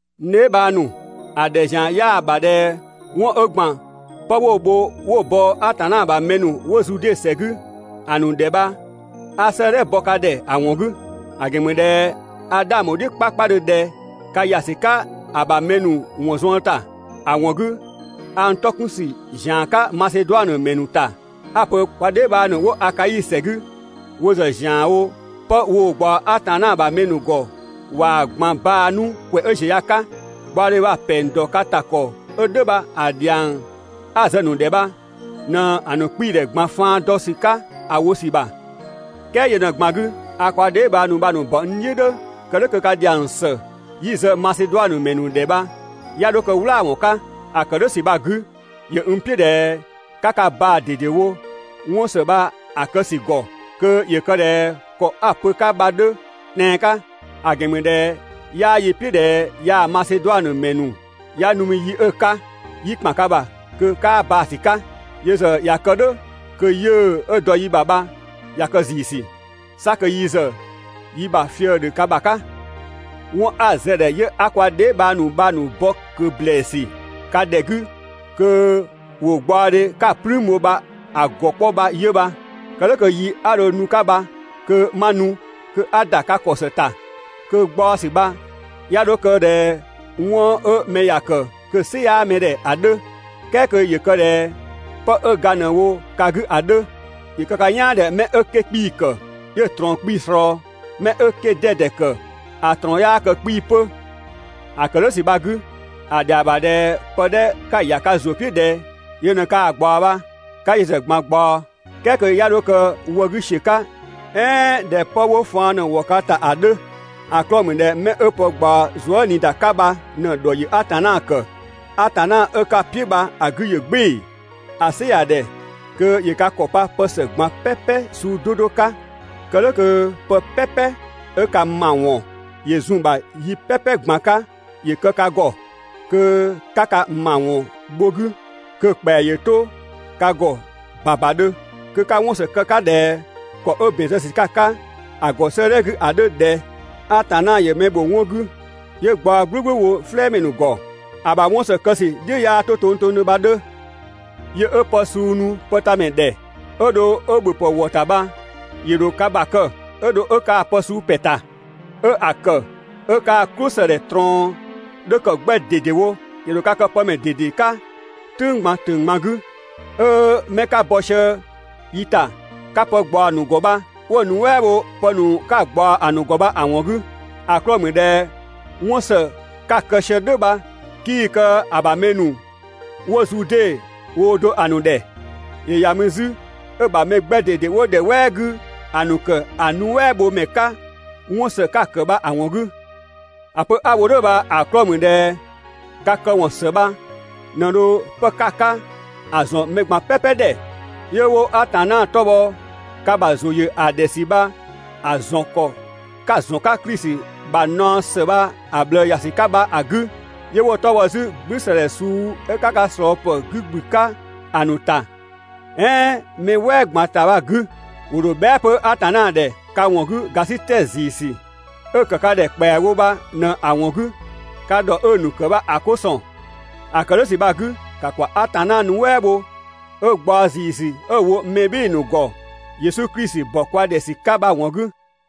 (N dheebhang ‑nu), ‑a ‑dhɛ ‑zian 'yaa‑ ‑bha ꞊dhɛ 'wɔn 'ö ‑gban pë 'wo‑ bho 'wo‑ bɔ Atanna ‑bha mɛ ‑nu 'wo Zude ‑sɛ 'gü‑ ‑nu ‑dhɛ bha 'a 'sëëdhɛ bɔ ka ‑dhɛ ‑a ‑wɔn 'gü. ‑A ‑gɛn ‑mü ꞊dhɛ a 'dhang bho‑ "dhiʋ̈ 'kpakpadhö ꞊dhɛ ka ‑ya ‑sü 'ka ‑a ‑bha mɛ ‑nu ‑wɔn zuën ‑ta. ‑A ‑wɔn 'gü a n 'tɔ 'kun ‑sü ‑zian 'ka Maseduanö ‑mɛ ‑nu ‑ta 'a‑ pö kwa dheebhang ‑nu 'wo Akai ‑sɛ 'gü wo ‑zë ‑zianwo 'pë woo‑ ꞊gbaɔ Atanna ‑bha mɛ ‑nu ‑gɔ ꞊waa‑ ꞊gban baa‑ 'nu ‑kwɛ 'ö ꞊ziö ya‑ 'ka. Gbaɔdhe bha‑ ‑pɛng ‑dɔ ka ‑ta ‑kɔ 'ö "dhʋ̈ bha‑ ‑dhiang 'a‑ zë‑ ‑nu ‑dhɛ bha ꞊në‑ ‑nu 'kpiidhɛ ꞊gban faan dɔ ‑sü 'ka ‑a wo ‑sü ‑bha. "Kɛɛ yö ꞊në‑ ꞊gban 'gü 'a kwa dheebhang ‑nu bha‑ ‑nu ‑bɔ "dhʋ̈, kë "dhʋ̈ kö ka ‑dhiang ‑së 'yi‑ zë Maseduanö ‑mɛ ‑nu ‑dhɛ bha 'ya 'dho kë "wlaawɔn 'ka. ‑A ‑kë "dhʋ̈ ‑sü bha‑ 'gü ‑yö n "piʋ̈ ꞊dhɛ 'ka ka baa ꞊dedewo 'wɔn ‑së bha‑ kë ‑sü ‑gɔ kö ‑yö kë ꞊dhɛ ‑kɔ 'a‑ pö‑ 'ka bha‑ 'dhö tɛan‑ 'ka. ‑A ‑gɛn ‑mü ꞊dhɛ 'yaa yi "piʋ̈ ꞊dhɛ yaa Maseduanö ‑mɛ ‑nu 'ya nu mü yi 'ö‑ 'ka, 'yi ‑kpan ka ‑bha kö 'kaa baa‑ ‑sü 'ka. Yö ‑zë ꞊ya kë "dhʋ̈ kö 'yiʋ̈‑ 'ö dɔ yi ‑bha bha ꞊ya kë ‑ziisü. 'Sa kö yi ‑zë yi ‑bha fië‑ ‑dhö ka ‑bha 'ka. 'Wɔn 'a zë‑ ‑dhɛ 'yö 'a kwa dheebhang ‑nu bha‑ ‑nu bɔ ꞊kö ‑blɛɛsü ka ‑dhɛ 'gü kö ‑wo gbaɔdhe 'ka‑ "plüün bho bha‑ ‑gɔ 'kpɔ bha 'yö bha. Kë "dhʋ̈ kö yi 'a dho nu‑ 'ka bha kö 'ma nu, kö 'a ‑da ka ‑kɔ ‑së ‑ta, kö ꞊gbaɔsü bha 'ya 'dho kë ꞊dhɛ 'wɔn 'ö mɛ ‑ya ‑kë kö‑ "sɩ 'yaa mɛ ‑dhɛ ‑a 'dhö, "kɛɛ kö ‑yö kë ꞊dhɛ pë 'ö ga ꞊në‑ wo ka 'gü ‑a 'dhö. ‑Yö kë ka "yaan ꞊dhɛ 'mɛ 'ö 'kee‑ 'kpii‑ ‑kë 'yö‑ ꞊trɔɔn 'kpii‑ ꞊slɔɔ, 'mɛ 'ö 'kee‑ 'dɛdɛ ‑kë ‑a ꞊trɔɔn 'yaa kë 'kpii‑ 'pö. ‑A ‑kë "dhʋ̈ ‑sü bha‑ 'gü, ‑a ‑dhɛa ‑bha ꞊dhɛ pë 'dhɛ 'ka‑ ‑ya ka ‑zʋ "piʋ̈ ꞊dhɛ yö ꞊në kaa‑ ꞊gbaɔ bha 'ka yö ‑zë ꞊gban ꞊gbaɔ, "kɛɛ kö 'ya 'dho kë wë 'gü ‑siö 'ka "ɛɛn ꞊dhɛ 'pë faan ꞊në‑ ‑wɔ ka ‑ta ‑a 'dhö, ‑a 'klɔɔ‑ ‑mü ꞊dhɛ 'mɛ 'ö pë ꞊gbaɔ zuëniida 'ka bha ꞊në‑ ‑dhɔ ‑yö Atanna ‑kë. Atanna 'ö 'ka‑ "piʋ̈ bha‑ 'gü ‑yö "gbɩɩ‑. ‑A "sɩ ‑ya ‑dhɛ kö ‑yö ka ‑kɔ pa pë ‑së ꞊gban "pɛpɛ suu 'do 'do 'ka kë "dhʋ̈ kö pë "pɛpɛ 'ö ka ‑mawɔn ‑yö zun‑ ‑bha yi "pɛpɛ ꞊gban 'ka ‑yö kë ka ‑gɔ, kö 'ka ka ‑mawɔn bho‑ 'gü, kö‑ ‑kpɛa ‑yö 'to ka ‑gɔ ‑babadhö, kö 'ka 'wɔnsë kë‑ 'ka ꞊dhɛ ‑kɔ 'ö ‑bɛn zë ‑sü 'ka‑ ‑a ‑gɔ 'sëëdhɛ 'gü ‑a 'dhö ꞊dhɛ: «Atanna ‑yö ö ‑bha mɛ ‑nu ‑bho 'wɔn 'gü, 'yö gbaɔ "gblʋ̈gblʋ̈ wo "flɛɛmɛ ‑nu ‑gɔ. ‑A ‑bha 'wɔn ‑së kë ‑sü "dhiʋ̈ 'yaa 'to tongtongdhö.» Yö 'ö pë suu nu pëtamɛ ‑dhɛ, 'ö dho 'ö‑ ‑bhöpë ‑wɔ ‑ta bha ‑yö ‑dho ka ‑bha kë, 'ö dho 'ö kaa‑ pë suu ‑pɛ ‑ta, 'ö‑ ‑kë 'ö kaa‑ "klʋsëdhɛ ꞊trɔɔn 'dhö ‑kë 'gbɛ ꞊dedewo. ‑Yö ‑dho ka kë pë ‑mɛ ꞊dede 'ka "tʋ̈ng ꞊gban ‑tʋ̈ng ꞊gban 'gü, 'ö 'mɛ 'ka bɔ sië yi ‑ta ka pë ꞊gbaɔ‑ ‑nu ‑gɔ bha 'wo‑ nuɛ" bho 'pë ‑nu 'ka‑ ꞊gbaɔ‑ ‑nu ‑gɔ bha‑ ‑wɔn 'gü. ‑A 'klɔɔ‑ ‑mü ꞊dhɛ 'wɔn ‑së 'ka‑ kë sië "dhʋ̈ bha 'kii‑ kë ‑a ‑bha mɛ ‑nu ('wo Zude) woo do ‑a ‑nu ‑dhɛ, ‑yö ‑ya mü 'zü 'ö‑ ‑bha) mɛ 'gbɛ ꞊dede ('wo ‑dhɛ "wɛɛ 'gü ‑a ‑nu) ‑kë ‑a nuɛ" bho ‑mɛ 'ka 'wɔn ‑së 'ka‑ ‑kë bha‑ ‑wɔn 'gü. ‑A pö 'a‑ wo "dhʋ̈ bha‑ 'klɔɔ‑ ‑mü ꞊dhɛ ka këwɔn ‑së bha ꞊në dho 'pë 'ka‑ 'ka ‑a ‑zɔn mɛ ꞊gban "pɛpɛ ‑dhɛ, 'yö 'wo Atanna 'tɔ bhɔ ka ‑bha ‑zʋ ‑yö ‑a ‑dhɛ ‑sü bha‑ ‑zɔn ‑kɔ 'ka‑ ‑zɔn 'ka Klisi ‑bha naɔ ‑së bha‑ ꞊bhlë ‑ya ‑sü 'ka bha‑ 'gü, 'yö 'wo‑ 'tɔ bhɔ 'zü "gblü ‑së ‑dhɛ suu 'ö 'ka ka ꞊slɔɔpë ‑nu 'gü ‑gblü 'ka ‑a ‑nu ‑ta, "ɛɛn mɛ "wɛɛ ꞊gban ‑ta bha‑ 'gü. ‑Wo ‑dho bhɛa" 'pö Atanna ‑dhɛ ka ‑wɔn 'gü ‑gasitɛ ‑ziisü 'ö‑ ‑kë ka ‑dhɛ ‑kpɛa wo bha ꞊në‑ ‑wɔn 'gü ka ‑dhɔ 'ö‑ ‑nu ‑kë bha‑ 'ko ‑sɔn. ‑A ‑kë "dhʋ̈ ‑sü bha‑ 'gü, ‑ka ‑kwa Atanna nuɛ" bho 'ö gbaɔ‑ ‑ziisü 'ö‑ wo mɛ ‑nu ‑gɔ (Yesu Klisi ‑bɔ kwa ‑dhɛ ‑sü 'ka) bha‑ ‑wɔn 'gü.